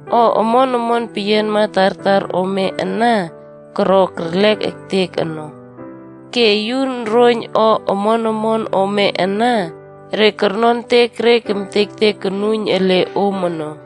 O omon peyianma tartar ome ana koro kerlek ektek ono. Ke yun roiyn o omon omon ome ana, re nonon kertek re kemtektek konuiyn ele om ono.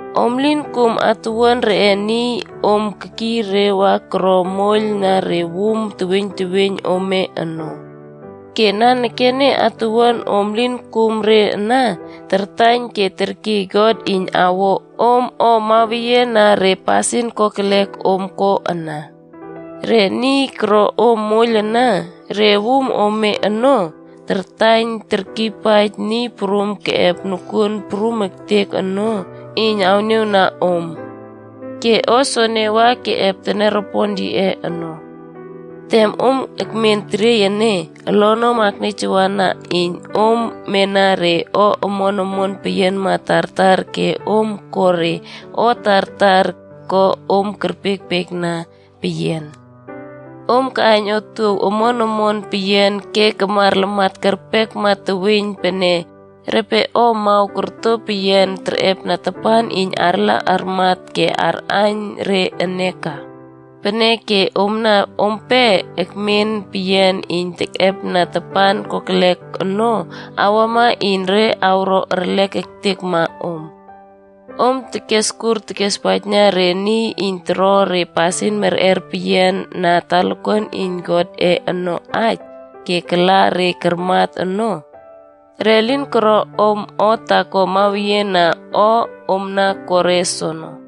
Om lin kum atuwuan reꞌe niy om kekiy re wa koro moiyl na re wum teweiyn teweiyn ome ono. Ke nanekene, atuwuan om lin kum re ana, tartaiyn ke terkiy God iyn awo om o mawenian na re pasin kokelek om ko ana. Re niy koro om moiylna re wum ome ono, tartaiyn terkiypaij Niy Prum Keꞌep Nokuon Prum Ektek ono, iyn awniawna om. Ke o soene wa keꞌep teniaropon yiꞌe ono. Tem om ekmen teriey ene, olonom nieyjawana iyn om mena re o omon peyianma tartar ke om ko re o tartar iyn ko om kerpiekpiekna peyian. Om kaꞌaiyn otuow omon omon peyian ke kamar lamat kerpekma teweiyn pene repe o amaw korto peyian terꞌepna tapan iyn arla armat ke arꞌaiyn re ene ka. Peneke omna ompe ekmen peyian iyn tekꞌepna tapan kokelek ono awama iyn re awro erlek ektekma om. Om keskur kespaijna re niy iyn toro re pasin merꞌer peyian na talakuan iyn Godꞌe ono aij ke kala re karmat ono. Re lin koro om o taako mawenian na o om na koro re soono.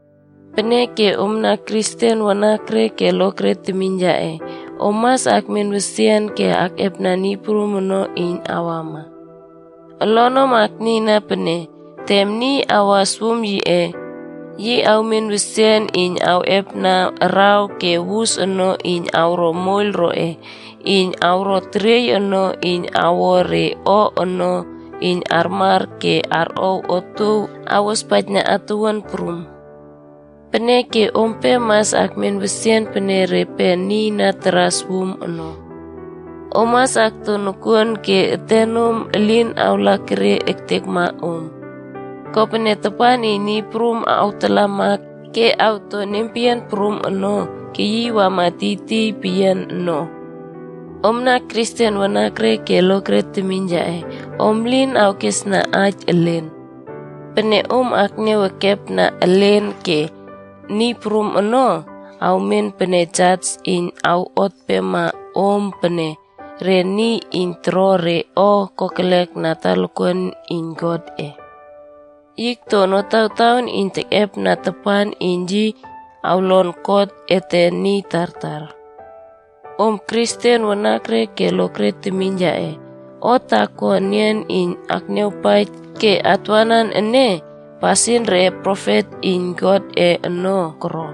Peneke, Omna Kristen wanakre ke lokre temiyn yaꞌe, om mas akmen wesian ke akꞌepna Niy Prum ono iyn awama. Olonom aknieyna pene, tem niy awas wum yiꞌe, yi awmen wesian ke awꞌepna araw ke wusa ono iyn awro moiyl roꞌe iyn awro teriey ono iyn awo re o ono iyn armar ke arꞌow otuow awospaijna atowuan prum. Peneke ompe mas akmen wesian pene repe niy taras wum ono. Om mas akto nokuon ke etenom elin awlakerie ektekma om. Kopene tapan iyn Niy Prum awꞌotalama ke awto nempeyian prum ono, keyiy akama tiytiy peyian no. Omna Kristen wanakre ke lokre temiyn yaꞌe, om elin awkesna aij elen. Pene om akniaw ekepna elen ke Niy Prum ono awmen pene jas iyn awot empema om pene re niy iyn koro re o kokelek na talakuan iyn Godꞌe. Yi okto notawtaon iyn tekꞌepna tapan iyn yi awlon kot ete niy tartar. Omna Kristen wanakre ke lokre temiyn yaꞌe, o taako enian iyn atniawpaij ke atwanan ene, pasin re profet iyn Godꞌe ono koro.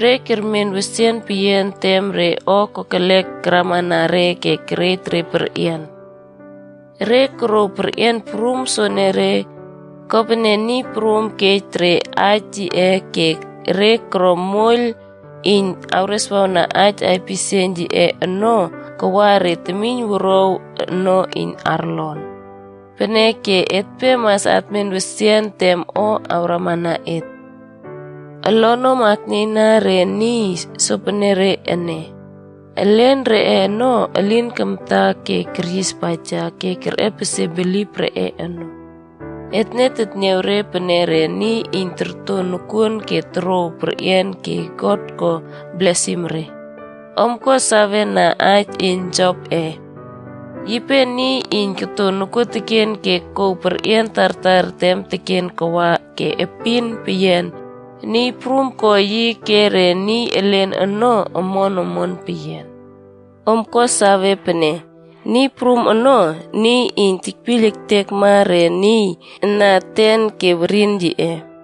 Re kermen wesian peyian tem re o kokelek karamana re ke kerej re perꞌian. Re korouw re perꞌian soenere, kopene Niy Prum kej re aij yiꞌe ke re koro moiyl iyn kereswawna aij aipisieiyn yiꞌe ono kawa re temiynwuruaw ono iyn arlon. Peneke etpe mas atmen wesian tem o awramana et. Olonom aknieyna re niy sopenere ene. Elen reꞌe ono elin kamta ke keryispaija ke kerꞌepesie bilip reꞌe ono. Etne tetniaw re pene re niy iyn korto nokuon ke korouw perꞌian ke God ko blesim re. Om ko sawena aij yin Jopꞌe. Yipe niy iyn koto nokuoteken ke kouw perꞌian tartar tem teken kawa ke epin peyian, Niy Prum ko yi ke re niy elen ono omon omon peyianb. Om ko sawe pene Niy Prum ono, niy iyn tekpiyl ektekma re niy na eten ke weriyn yiꞌe.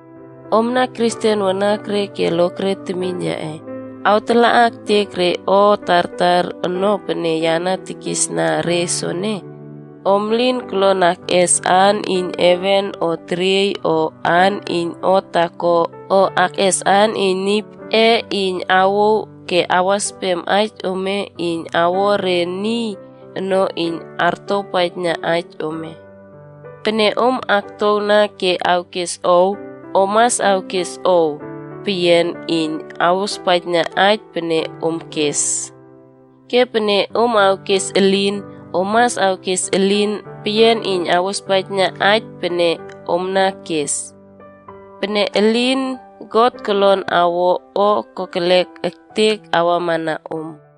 Omna Kristen wanakre ke lokre temiyn yaꞌe, awtalaꞌa ektek re o tartar ono pene ya na kisna re soene, om lin kolon akꞌes aan iyn heven o teriey o aan iyn o taako o akꞌes aan iyn Niy Prumꞌe iyn awouw ke awaspem aij ome iyn awo re niy ono iyn artowpaijna aij ome. Pene om aktowna ke awkes “ow” om mas awkes “ow” peyian iyn awospaijna aij pene om kes. Ke pene om awkes “elin” om mas awkes “elin” peyian iyn awospaijna aij pene om kes. Pene elin, God kolon awo o kokelek ektek awamana om.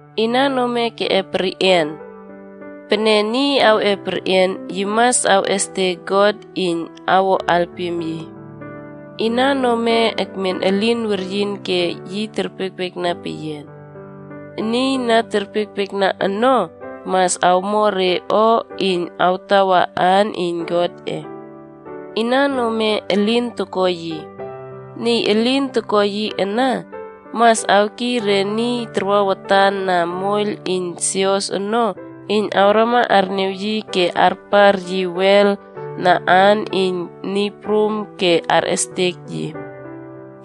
Inan ome keꞌep perꞌian? Pene niy keꞌep perꞌian, yi mas awꞌestek God iyn awo alpim yi. Inan ome ekmen elin weryin ke yi terpiekpiekna peyian? Niy na terpiekpiekna ono, mas awmo re o iyn awtawa aan iyn Godꞌe. Inan ome elin toko yi? Niy elin toko yi ana, mas awkiy re niy tarwa watan na moiyl iyn sios ono iyn awrama arniaw yi ke arpar yi wel na aan iyn Niy Prum ke arꞌestek yi.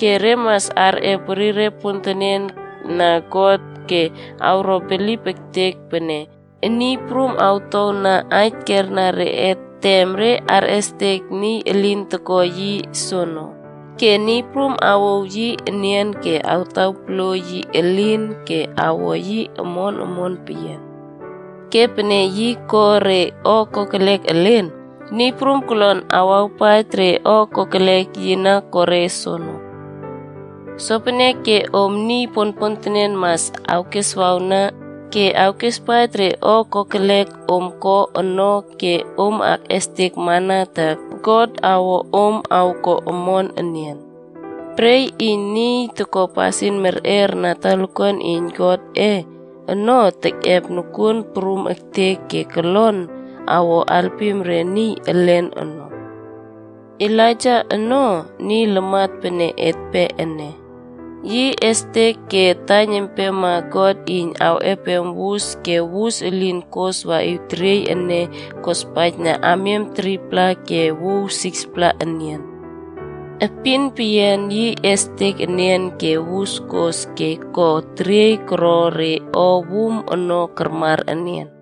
Ke re mas arꞌep werire pontenen na God ke awro bilip ektek pene Niy Prum awtowna aij kierna reꞌe tem re arꞌestek niy elin toko yi soono, ke Niy Prum awouw yi enian ke awtawpoluo yi elin ke awo yi omon omon peyian. Ke pene yi ko re o kokolek elen, Niy Prum kolon awawpaij re o kokelek yi na ko re soono. Sopeneke om niy ponpontenen mas awkeswawna ke awkespaij re o kokelek om ko ono ke om akꞌestekmana ta God awo om awko omon enian. Pre iyn niy toko pasin merꞌer na talakuan iyn Godꞌe ono tekꞌep nokuon prum ektek ke kolon awo alpim re niy elen ono. Elaijac ono niy lamat pene etpe ene. Yi estek ke taiyn empema God iyn awꞌepem wus ke wus elin kos waꞌiw teriey ene kospaijna amiam 3-pla ke wuw 6-pla enian. Epin peyian yi estek enian ke wus kos ke ko teriey koro re o wum ono kamar enian.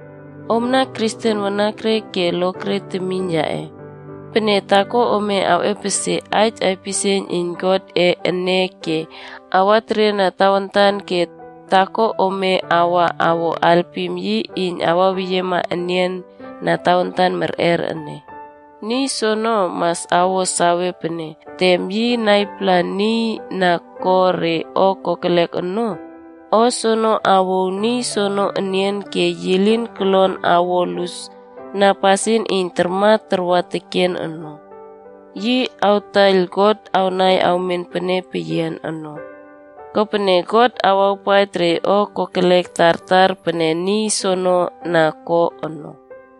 Omna Kristen wanakre ke lokre temiyn yaꞌe, pene taako ome awꞌepesie aij aipisieiyn iyn Godꞌe ene ke awateriena tawantan ke taako ome wa awo alpim yi iyn awaweyiema enian na tawantan merꞌer ene, niy soono, mas awo sawe pene tem yi naipala niy na ko re o kokelek ono, o soene awouw niy soono enian ke yi lin kolon awo lus na pasin iyn tarmat takwa teken ono. Yi awtaiyl God awnai awmen pene peyian ono. Kopene God awawpaij re o kokelek tartar pene niy soono na ko ono.